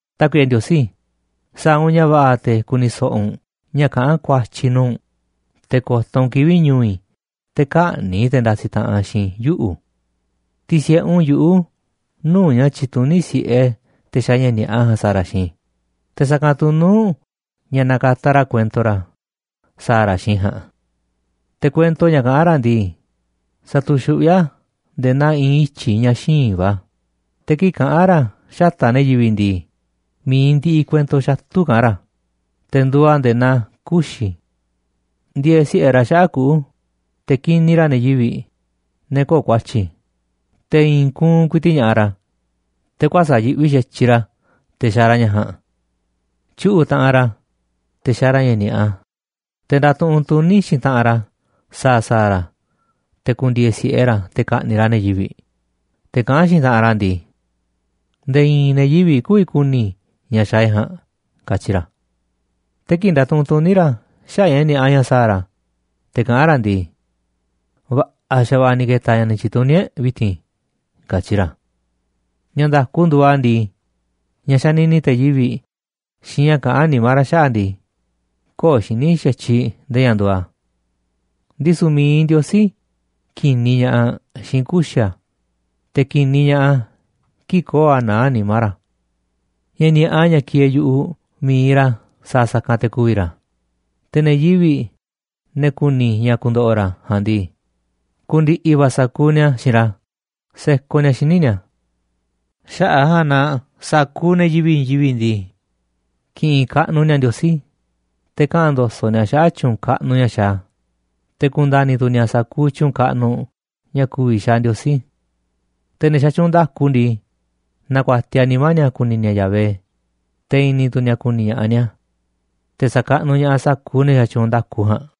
Tákuiꞌe Ndiosí, sa̱a̱ u̱nꞌ ña̱ va̱ꞌa̱ te̱ ku̱ni̱ so̱ꞌo̱ u̱nꞌ ña̱ kaꞌán ku̱a̱tyi̱ i̱ nuu̱ꞌ u̱nꞌ, te̱ ko̱to̱ u̱nꞌ kivi̱ꞌ ñu̱u̱ i̱ te̱ kä̱ꞌni̱ꞌ te̱ ndasiꞌ taꞌanꞌ xiinꞌ i̱ yuꞌu̱. Ti̱si̱ꞌe u̱nꞌ yuꞌu̱ nuu̱ꞌ ña̱ tyituní si̱ꞌe te̱ xaaꞌ ña̱ ni̱a̱ꞌa ja̱a̱nꞌ sa̱a̱ ra̱ xiinꞌ i̱, te̱ sa̱kanꞌ tu̱ nuu̱ꞌ ña̱ nakataꞌ ra̱ kuento ra̱ sa̱a̱ ra̱ xiinꞌ i̱ ja̱a̱nꞌ. Te̱ kuento ña̱ kaꞌán ra̱ ndii, satuxuꞌví a̱ nde̱e̱ naa i̱i̱n ityi̱ ña̱ xíinꞌ va̱, te̱ kii̱ꞌ kaꞌán ra̱ xata̱ꞌ ne̱ yivi̱ꞌ ndii, mi̱iꞌ ndiꞌiꞌ kuento xatu̱ kaꞌán ra̱, te̱ nduuꞌ a̱ nde̱e̱ naa kuxi̱. Ndieeꞌ si̱ꞌe ra̱ xaꞌa̱ꞌ kuꞌu̱ te̱ kiniꞌ ra̱ ne̱ yivi̱ꞌ, ne̱ köo̱ꞌ ku̱a̱tyi̱, te̱ i̱i̱n kuunꞌ ku̱i̱ti̱ꞌ ña̱ꞌaꞌ ra̱, te̱ kuäsa̱ꞌ yiꞌvi xa̱tyiꞌ ra̱ te̱ xaaꞌ ra̱ ña̱ ja̱a̱nꞌ. Tyuꞌu̱ꞌ taꞌanꞌ ra̱ te̱ xaaꞌ ra̱ ña̱ ni̱a̱ꞌa, te̱ ndatuꞌunꞌ tuní xiinꞌ taꞌanꞌ ra̱ sa̱a̱ sa̱a̱ ra̱ te̱ ku̱ndi̱e̱e̱ si̱ꞌe ra̱ te̱ ka̱ꞌni̱ꞌ ra̱ ne̱ yivi̱ꞌ, te̱ kaꞌán xiinꞌ taꞌanꞌ ra̱ ndii: “Nde̱e̱ i̱i̱n ne̱ yivi̱ꞌ kü̱vi̱ ku̱ni̱ ña̱ xaaꞌ e̱ꞌ ja̱a̱nꞌ”, katyi ra̱. Te̱ kii̱ꞌ ndatuꞌunꞌ tuní ra̱ xaꞌa̱ꞌ ña̱ ni̱a̱ꞌa ña̱ sa̱a̱ ra̱, te̱ kaꞌán ra̱ ndii: “Va̱ꞌa̱ xa̱va̱ꞌa̱ ni̱ ke̱ta̱ ña̱ ni̱ tyi̱ntuní e̱ꞌ vi̱ti̱n”, katyi ra̱. Ña̱ nda̱ku nduuꞌ a̱ ndii, ña̱ xanini te̱ yivi̱ꞌ xiinꞌ ña̱ kaꞌán nimá ra̱ xaꞌa̱ꞌ ndii, köo̱ꞌ xiní xa̱tyiꞌ nde̱e̱ ña̱ nduuꞌ a̱. Ndisu̱ mi̱iꞌ Ndiosí ki̱niꞌ ña̱ꞌaꞌ xiinꞌ kuxi̱ a̱, te̱ ki̱niꞌ ña̱ꞌaꞌ a̱ kii̱ꞌ köo̱ꞌ a̱ naá nimá ra̱. Ña̱ ni̱a̱ꞌa ña̱ kieeꞌ yu̱ꞌuꞌ mi̱iꞌ ra̱ sa̱a̱ sa̱kanꞌ te̱ ku̱vi̱ ra̱, te̱ ne̱ yivi̱ꞌ, ne̱ ku̱ni̱ ña̱ ku̱ndo̱ꞌo̱ ra̱ ja̱a̱nꞌ ndii, ku̱ndi̱ꞌi̱ va̱ sa̱kuuꞌ ni̱a̱ xiinꞌ ra̱ sekoꞌ ni̱a̱ xíniꞌ ni̱a̱. Xaꞌa̱ꞌ a̱ ja̱a̱nꞌ na sa̱kuuꞌ ne̱ yivi̱ꞌ i̱i̱n yivi̱ꞌ ndii, ki̱ꞌi̱n kaꞌnuꞌ ni̱a̱ Ndiosí, te̱ kaꞌa̱n ndo̱so̱ꞌ ni̱a̱ xaꞌa̱ꞌ tyu̱u̱n kaꞌnuꞌ ña̱ xaaꞌ a̱, te̱ ku̱nda̱ni̱ tu̱ ni̱a̱ sa̱kuuꞌ tyu̱u̱n kaꞌnuꞌ ña̱ ku̱vi̱ xaaꞌ Ndiosí. Te̱ ne̱ xatyuunꞌ nda̱ku ndii, na̱ku̱a̱tiaꞌ nimá ni̱a̱ ku̱ni̱ ni̱a̱ Yahvé, te̱ i̱ni̱ tu̱ ni̱a̱ ku̱ni̱ ña̱ꞌaꞌ ni̱a̱. Te̱ sa̱kaꞌnuꞌ ña̱ꞌaꞌ sa̱kuuꞌ ne̱ xatyuunꞌ nda̱ku ja̱a̱nꞌ.